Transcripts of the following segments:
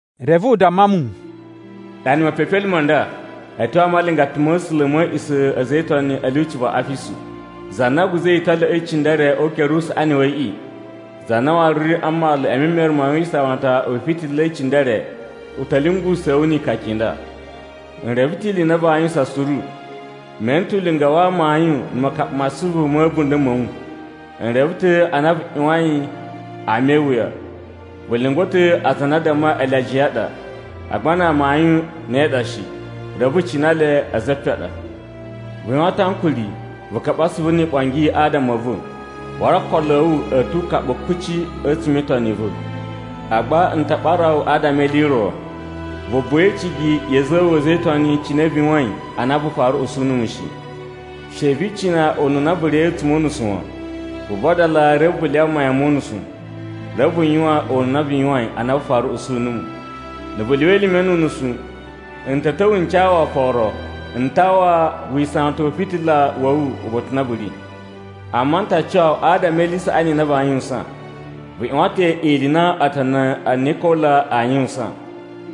Reve u damma mu, “Ɗana mepepelime ma nda a̱ tyo a malingata ma̱ A̱sula̱ ma̱ a̱a̱ꞌisa̱ a̱ a̱za̱ e Itoni a̱ lyuci va Afisu. Za na guza̱i italyoꞌo i cindere o ukere usaꞌani wa̱ yiꞌi, za na waru ri a mmalu e memere ma wisawatan wi ifitila i cindere, u ta̱ lyungusa̱a̱ wu ikaka i nda: N reve ta̱ ili i na vaa yuwusan suru, me ene ta̱ ulinga wa amayun na̱ makaɓa ma asuvu ma̱ a̱bunda̱ ma̱ wu. N reve ta̱ a na vu ꞌyuwain ama e iwuya. Vu lyungwa̱ ta̱ aza a na a dammai ele ajiya a ɗa, agba na amayun ne ɗa shi, reve vu cina le a̱za̱ e epen a ɗa. Vu yuwan ta̱ ankuri vu kaɓa asuvu ni iɓongi adama a̱ va̱, waru okolo a̱ wu a̱ tu ukaɓu kuci a̱tsuma̱ e itoni i va̱. “Agba n ta ɓara wu adama e ili i ro. Vu buwa e icigi ya̱ a̱za̱ a̱ wu a̱za̱ e Itoni cine vu yuwain ana vu fara usu numu shi. She vi icina ununa vu riya̱i a̱tsuma̱ o unusu wan! Vu vadala reve vu lyawa mayan mo unusu, reve vu yuwan ununa vu yuwain ana vu fara usu numu. Na̱ vu lyuwa elime nu unusu, n ta̱ ta̱wa̱ n ca wu oforo n tawa wisawatan u fitila wa̱ wu uba̱ta̱ u na u ri. Amma n ta cuwa wu adama e ili i saꞌani i na vaa yuwusan. Vu ꞌyuwan ta̱ ili i na otoni a Nikola aa yuwusan,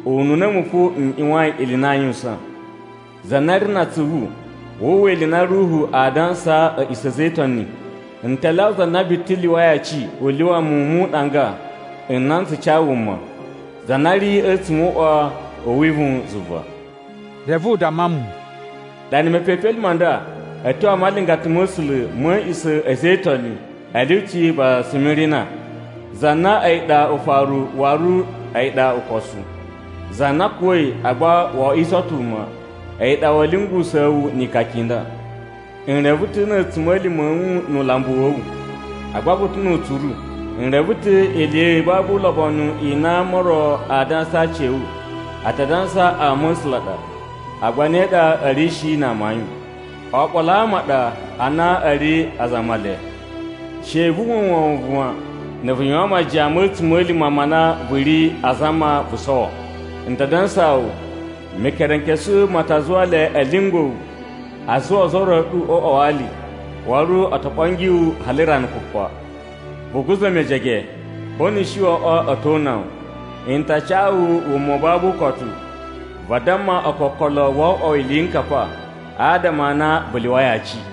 ununa a̱mu fo n ꞌyuwain ili i na aa yuwusan. “Za na ri na atsuvu, wu uwwa ili i na Ruhu aa dansaa a̱ꞌisa̱ a̱ a̱za̱ e Itoni! N ta lyawa za na biti lyuwai aci u lyuwa muwun mu uɗanga n na n tsu ca wuma, za na ri a̱tsuma̱ o uꞌwa u wivuwun zuva.” Reve u damma mu, “Ɗana mepepelime ma nda a̱ tyo a malingata ma̱ A̱sula̱ ma̱ a̱a̱ꞌisa̱ a̱ a̱za̱ e Itoni a̱ lyuci va Simirina. Za na a̱yi ɗa Ufaru waru a̱yi ɗa Ukosu, za na kuwa̱i agba wo oꞌwiso ta̱ wuma, a̱yi ɗa wa̱a̱ lyungusa̱a̱ wu ni ikaka i nda: N reve ta̱ na̱ a̱tsuma̱lima̱ a̱ wu nu ulambu wa̱ wu, agba vu ta̱ nu utsuru! N reve ta̱ ni ili i babu ulobonu i na ama o ro a dansa a aci a̱ wu. A ta dansa ama a̱ A̱sula̱ a ɗa, agba ne ɗa a̱ ri shi na amayun. Oɓolo a ama a ɗa a na a̱ ri aza a Male. She vu uwwa wovon wan, na̱ vu yuwan majiyan ma̱ a̱tsuma̱lima̱ ma na vu ri azama vu sowo. N ta dansaa wu, Mekerenkesu ma ta zuwa le a̱ lyungwa̱ wu a zuwa ozo o ro a̱ ɗu o uꞌwa wa ali, waru o to ɓongi wu hali rana kupa. Vu guza̱ mejege, ko nu u shi wo oꞌwo a̱ to una wu, n ta ca wu wuma u babu ukotu vadamma ookokolo wo oꞌwo wu iliyinkapa adama a na vu lyuwai aci.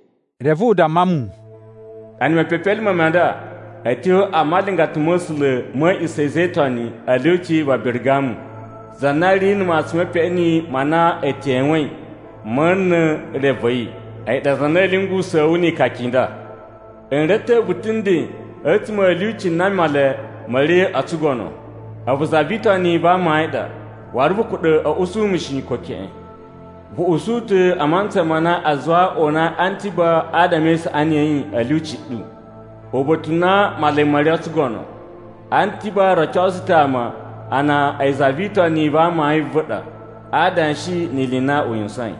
Reve u damma mu, “Ɗana mepepelime ma nda a̱ tyo a malingata ma̱ A̱sula̱ ma̱ a̱a̱ꞌisa̱ a̱ a̱za̱ e Itoni a̱ lyuci va Birigamu. Za na ri na̱ matsun me peꞌeni ma na e tewein ma̱ na̱ re va̱ yi, a̱yi ɗa za na a̱ lyungusa̱a̱ wu ni ikaka i nda: N reve ta̱ vu ta̱ nden a̱tsuma̱ a̱ lyuci na Male ma̱ ri o tsugono. A̱vu za vi Itoni va amayun a ɗa, waru vu kuɗa̱ a̱ usu mu shi, ko keꞌen. Vu usu ta̱ a mantsa ma na a zuwai o unai Antiba adama e isaꞌani ya̱ yi a̱ lyuci ɗu, uba̱ta̱ u na Male ma̱ ri o tsugono. Antiba rocosu ta̱ ama a na a̱yi za vi Itoni va amayun a̱ va̱ a ɗa a adanshi ni ili i na u yuwusain.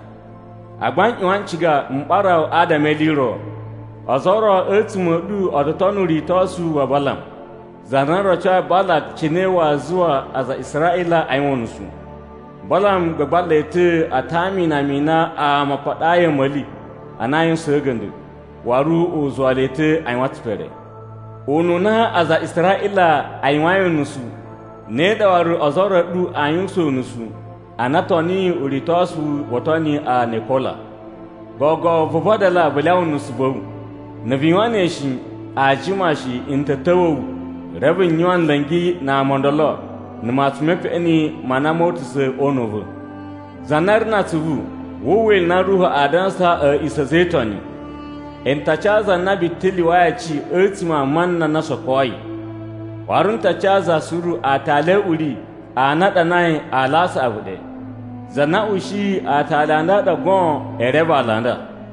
“Agba n ꞌyuwan n ciga m ɓara wu adama e ili i ro. Ozo o ro a̱tsuma̱ a̱ ɗu o to tono uritosu wa Balam, za na rocoyi Balak cine waa zuwa aza a Israꞌila a yuwan unusu. Balam gbagba le ta̱ a tama inama i na ama a paɗayi a̱ma̱li a na a yuwusaan a̱ga̱nda̱. Waru u zuwa le ta̱ a yuwan tsipere. Ununa aza a Israꞌila a yuwain unusu, ne ɗa waru ozo o ro a̱ ɗu a yuwain unusu ana o toniyi uritosu wo otoni a Nikola. Gogo vu vadala vu lyawa nusu va̱ wu! Na̱ vu yuwan ne shi, aa jima shi n ta̱ ta̱wa̱ wu reve n yuwan nla̱ngi na ama o ndolo na̱ matsun me peꞌeni ma na moo utusa̱ o una̱ u va̱. “Za na ri na atsuvu, wu uwwa ili i na Ruhu aa dansaa a̱ꞌisa̱ a̱ a̱za̱ e Itoni! N ta ca za na biti lyuwai aci a̱tsuma̱ a mana na o sokoi. Waru n ta ca za suru aatali a̱ uri a na a ɗanai aala a saꞌavu ɗe. Za na ushiyi aatali a nda a ɗa goon ee reve aala a nda.”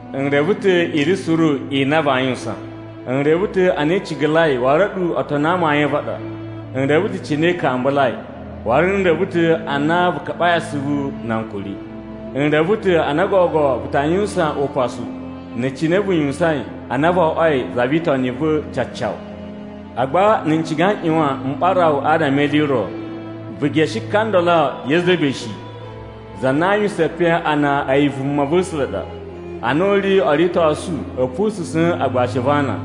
N reve ta̱ ili suru i na vaa yuwusan. N reve ta̱ a na i cigalai waru a̱ɗu otoni a amayun a̱ va̱ a ɗa. N reve ta̱ cine i kambulai, waru n reve ta̱ a na vu kaɓai asuvu na ankuri. N reve ta̱ a na gogo vu ta yuwusan upasu na̱ cine vu yuwusain ana vo oꞌwoi za vi Itoni va̱ cacawu. “Agba n ciga n ꞌyuwan m ɓara wu adama e ili i ro. Vu geshe ka ndolo Yezebe shi, za na a yuwusan epen a na a̱yi vumava̱sula̱ ɗa. Ana u ri o uritosu a̱ pususa̱n agbashi a̱ va̱ ana,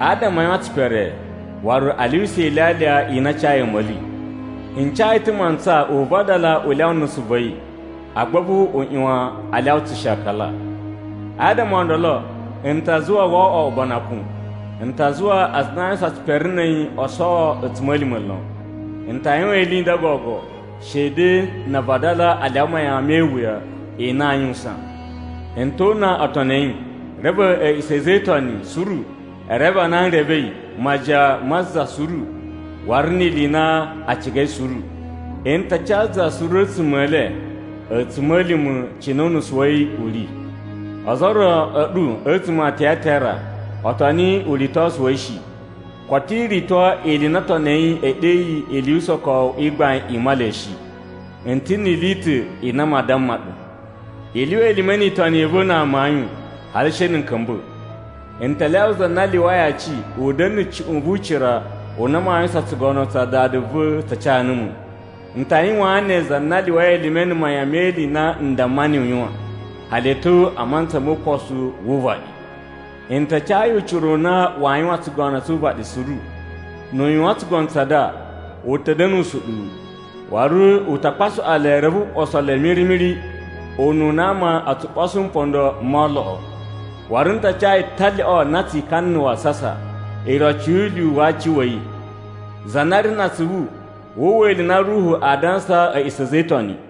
adama a yuwan tsipere waru a lyuwusa ilyalya i na a cayi a̱ma̱li. N ca yi ta̱ mantsa u vadala u lyawa nusu va̱ yi, agba a̱vu u ꞌyuwan a lyawa tsushakala. Adama o ndolo, n ta zuwa wo oꞌwo ubanakun. N ta zuwa aza a na a yuwusan tsipere na̱ a̱yi o sowo a̱tsuma̱lima̱ lon. N ta yuwan ili i nda gogo shede na a vadala a lyawa mayan me iwuya i na aa yuwusan. N to una otoni a̱ yi. Reve a̱ꞌisa̱ a̱ a̱za̱ e Itoni suru e reve a na n revei majiyan ma za suru waru ni ili i na a cigai suru. N ta ca za suru a̱tsuma̱ e le a̱tsuma̱lima̱ cine unusu wa̱ yi u ri. Ozo o ro a̱ ɗu a̱tsuma̱ a Tayatira o toni uritosu wa̱ yi shi. Koto i rito ili i na otoni a̱ yi e ɗeyi ‘Ili yu usokowu i gbain i Male’ shi. N ta̱ ni ili i ta̱ i na maa damma ɗu: I lyuwa elime ni itoni i va̱ na amayun hali she na̱ n ka̱mba̱. “N ta lyawa za na lyuwai aci u da̱na̱ na̱ cuꞌun vu ucira u na waa yuwan tsugono tsa na Dada va̱ ca numu. N ta yuwaan ne za na lyuwai elime na̱ mayan me ili i na n damma niyi u yuwan, hali a̱ tyo mantsa mo ukosu wu uvaɗi. N ta ca yi ucira u na waa yuwan tsugono tsu uvaɗi suru. Nu u yuwan tsugono tsa nda, u ta̱ da̱na̱ usuɗuwu, waru u ta kpasuꞌwa le reve o ɓoso le miri-miri ununa ama o tsu ɓoso mpondo mo oloꞌo. Waru n ta ca yi talyoꞌo na tsi ikana na̱ wasasa, iroci yu ulyuwu wa aci wa̱ yi. Za na ri na atsuvu, wu uwwa ili i na Ruhu aa dansaa a̱ꞌisa̱ a̱ a̱za̱ e Itoni!”